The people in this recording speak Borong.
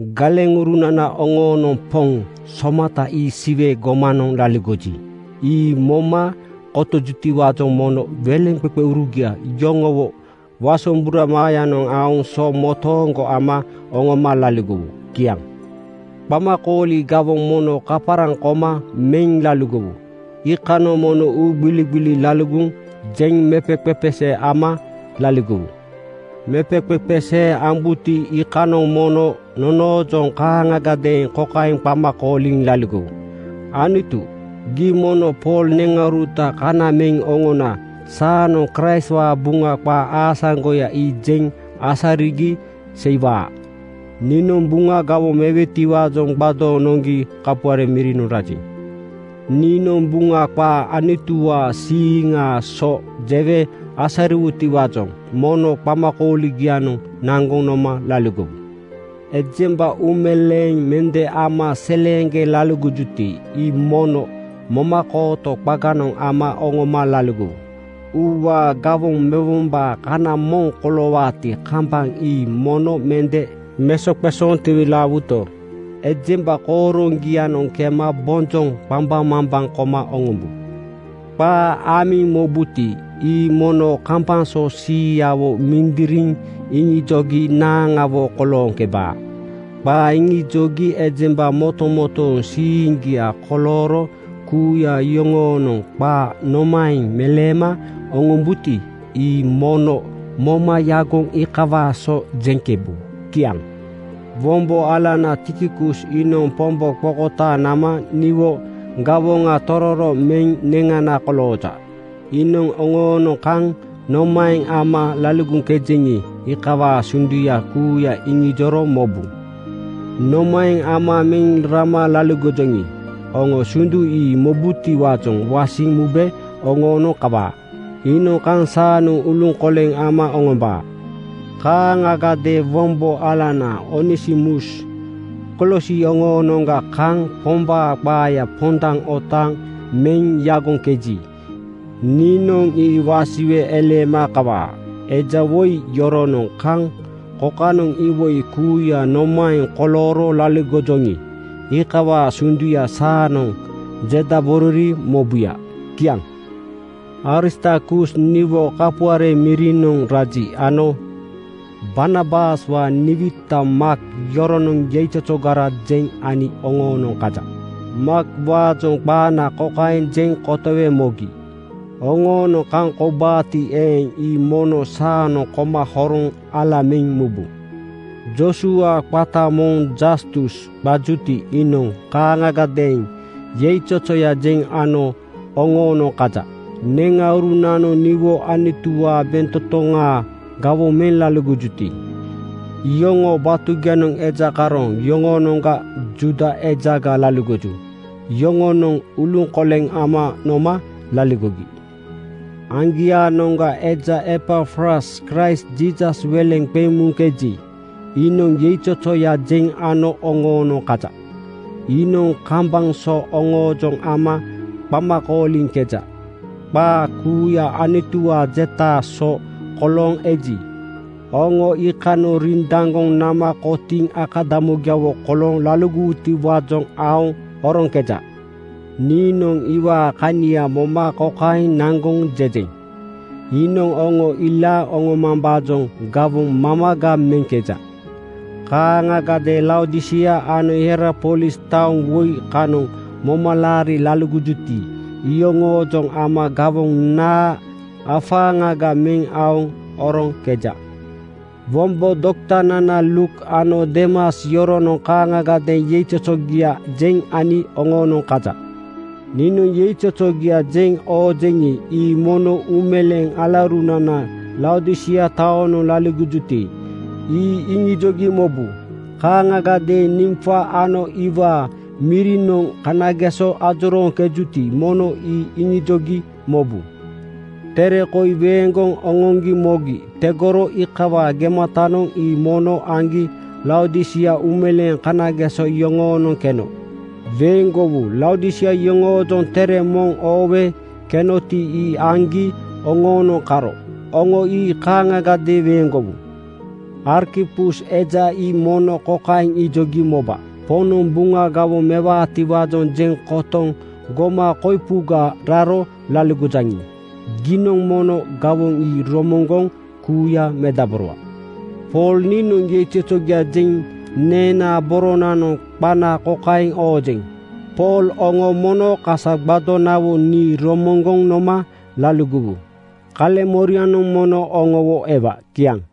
Galeŋurunana oŋoonoŋ Poŋ somata ii Siwe gomanoŋ laligoji, ii moma kotojutiwaajoŋ mono weleŋqeqeurugia yoŋowo wasombura maayanoŋ aoŋ so motooŋgo ama oŋoma laligowu. Kiaŋ. Qamakooli gawoŋ mono kaparaŋ koma meŋ laligowu. Iikanoŋ mono uugbiligbili laligoŋ jeŋ mepeqepesee ama laligowu. Mepeqepesee ambuti iikanoŋ mono nonoojoŋ kaaŋagadeeŋ kokaeŋ qama kooliŋ laligowu, “Anutu, gii mono Pool neŋauruta kana meŋ oŋona saanoŋ Kraistwaa Buŋa qaa aasaŋgoya ii jeŋ asarigi seiwaa.” Niinoŋ Buŋa gawoŋ mewetiwaajoŋ gbadooŋ noŋgi kapuare mirinoŋ rajeŋ. Niinoŋ Buŋa qaa Anutuwaa siiŋaa so jewe asariwutiwaajoŋ mono qamakooligianoŋ naŋgoŋ noma laligowu. Ejemba uumeleeŋ mende ama seleeŋgeŋ laligojuti ii mono momakooto qaganoŋ ama oŋoma laligowu. Uuwaa gawoŋ mewombaa kana moŋ koloowaati kambaŋ ii mono mende mesoqesooŋ tiwilaawuto, ejemba kooroŋgianoŋ kema bonjoŋ qambaŋmambaŋ koma oŋombu. Qaa amiŋ mobuti, ii mono kambaŋ so siiyawo mindiriŋ iŋijogi naaŋawo kolooŋkeba. Qaa iŋijogi ejemba motomotooŋ siiŋgia kolooro kuuya yoŋoonoŋ qaa nomaeŋ meleema oŋombuti ii mono moma yagoŋ iikawaa so jeŋkebu. Kiaŋ. Wombo alana Tikikus iinoŋ Pombo qokotaaŋ nama niwo gawoŋa tororo meŋ neŋana kolooja. Iinoŋ oŋoonoŋ kaŋ nomaeŋ ama laligoŋkejeŋi, iikawaa sunduya kuuya iŋijoro mobu. Nomaeŋ ama meŋ rama laligojoŋi, oŋo sundu ii mobutiwaajoŋ wasiŋ mube oŋoonoŋ kawaa. Iinoŋ kaŋ saanoŋ uluŋkoleŋ ama oŋombaa. Kaaŋagadeeŋ wombo alanana Onesimus Kolosi oŋoonoŋga kaŋ Pombaa qaaya pondaŋ otaaŋ meŋ yagoŋkeji, niinoŋ ii wasiwe eleema kawaa. Eja woi yoronoŋ kaŋ kokanoŋ iwoi kuuya nomaeŋ kolooro laligojoŋi, iikawaa sunduya saanoŋ jedaborori mobuya. Kiaŋ. Aristarkus niwo kapuare mirinoŋ raji ano Barnabaswaa niwita Maak yoronoŋ yeizozogara jeŋ ani oŋoonoŋ kaja. Maakwaajoŋ qaana kokaeŋ jeŋ kotowe mogi: Oŋoonoŋ kaŋ koubaati eeŋ, ii mono saanoŋ koma horoŋ ala meŋ mubu. Joosua qata moŋ Jastus qajuti iinoŋ kaaŋagadeeŋ yeizozoya jeŋ ano oŋoonoŋ kaja. Neŋaurunanoŋ niwo Anutuwaa bentotoŋaa gawoŋ meŋ laligojuti iyoŋoo batugianoŋ eja karooŋ yoŋonoŋga Juuda ejaga laligoju. Yoŋonoŋ uluŋkoleŋ ama noma laligogi. Aŋgiaanoŋa eja Epafras Kraist Jiisas weleŋ qeŋ muŋkeji, iinoŋ yeizozoya jeŋ ano oŋoonoŋ kaja. Iinoŋ kambaŋ so oŋoojoŋ ama qama kooliŋkeja. Qaa kuuya Anutuwaa jetaa so kolooŋ eji, oŋo iikanoŋ rindaŋgoŋ nama kotiiŋ akadamugiawo kolooŋ laligowutiwaajoŋ aoŋ oroŋkeja. Niinoŋ iwaa kania moma kokaeŋ naŋgoŋ jejeŋ: Iinoŋ oŋo ilaaŋ oŋomambaajoŋ gawoŋ mamaga meŋkeja. Kaaŋagadeeŋ Laodisia ano Hierapolis taoŋ woi kanoŋ moma laariŋ laligojuti iyoŋoojoŋ ama gawoŋ naa afaaŋaga meŋ aoŋ oroŋkeja. Wombo doktanana Luuk ano Deemas yoronoŋ kaaŋagadeeŋ yeizozogia jeŋ ani oŋoonoŋ kaja. Niinoŋ yeizozogia jeŋ oojeŋi, ii mono uumeleeŋ alaurunana Laodisia taonoŋ laligojuti, ii iŋijogi mobu. Kaaŋagadeeŋ Nimfa ano iwaa mirinoŋ kanageso ajorooŋkejuti mono ii iŋijogi mobu. Tere koi weeŋgoŋ oŋoŋgi mogi tegoro iikawaa gematanoŋ ii mono aŋgi Laodisia uumeleeŋ kanageso yoŋoonoŋ keno weeŋgowu. Laodisia yoŋoojoŋ tere moŋ oowe kenoti ii aŋgi oŋoonoŋ karo oŋo ii kaaŋagadeeŋ weeŋgowu. Arkipus eja ii mono kokaeŋ ijogi moba, “Poŋnoŋ Buŋa gawoŋ mewaatiwaajoŋ jeŋ kotoŋ goma koipuga raro laligojaŋi, giinoŋ mono gawoŋ ii romoŋgoŋ kuuya medaborowa.” Pool niinoŋ yeizozogia jeŋ neenaa boronanoŋ qana kokaeŋ oojeŋ: Pool. Oŋo mono kasa gbadonawo nii romoŋgoŋ noma laligowu. Kaleŋmorianoŋ mono oŋowo ewa. Kiaŋ.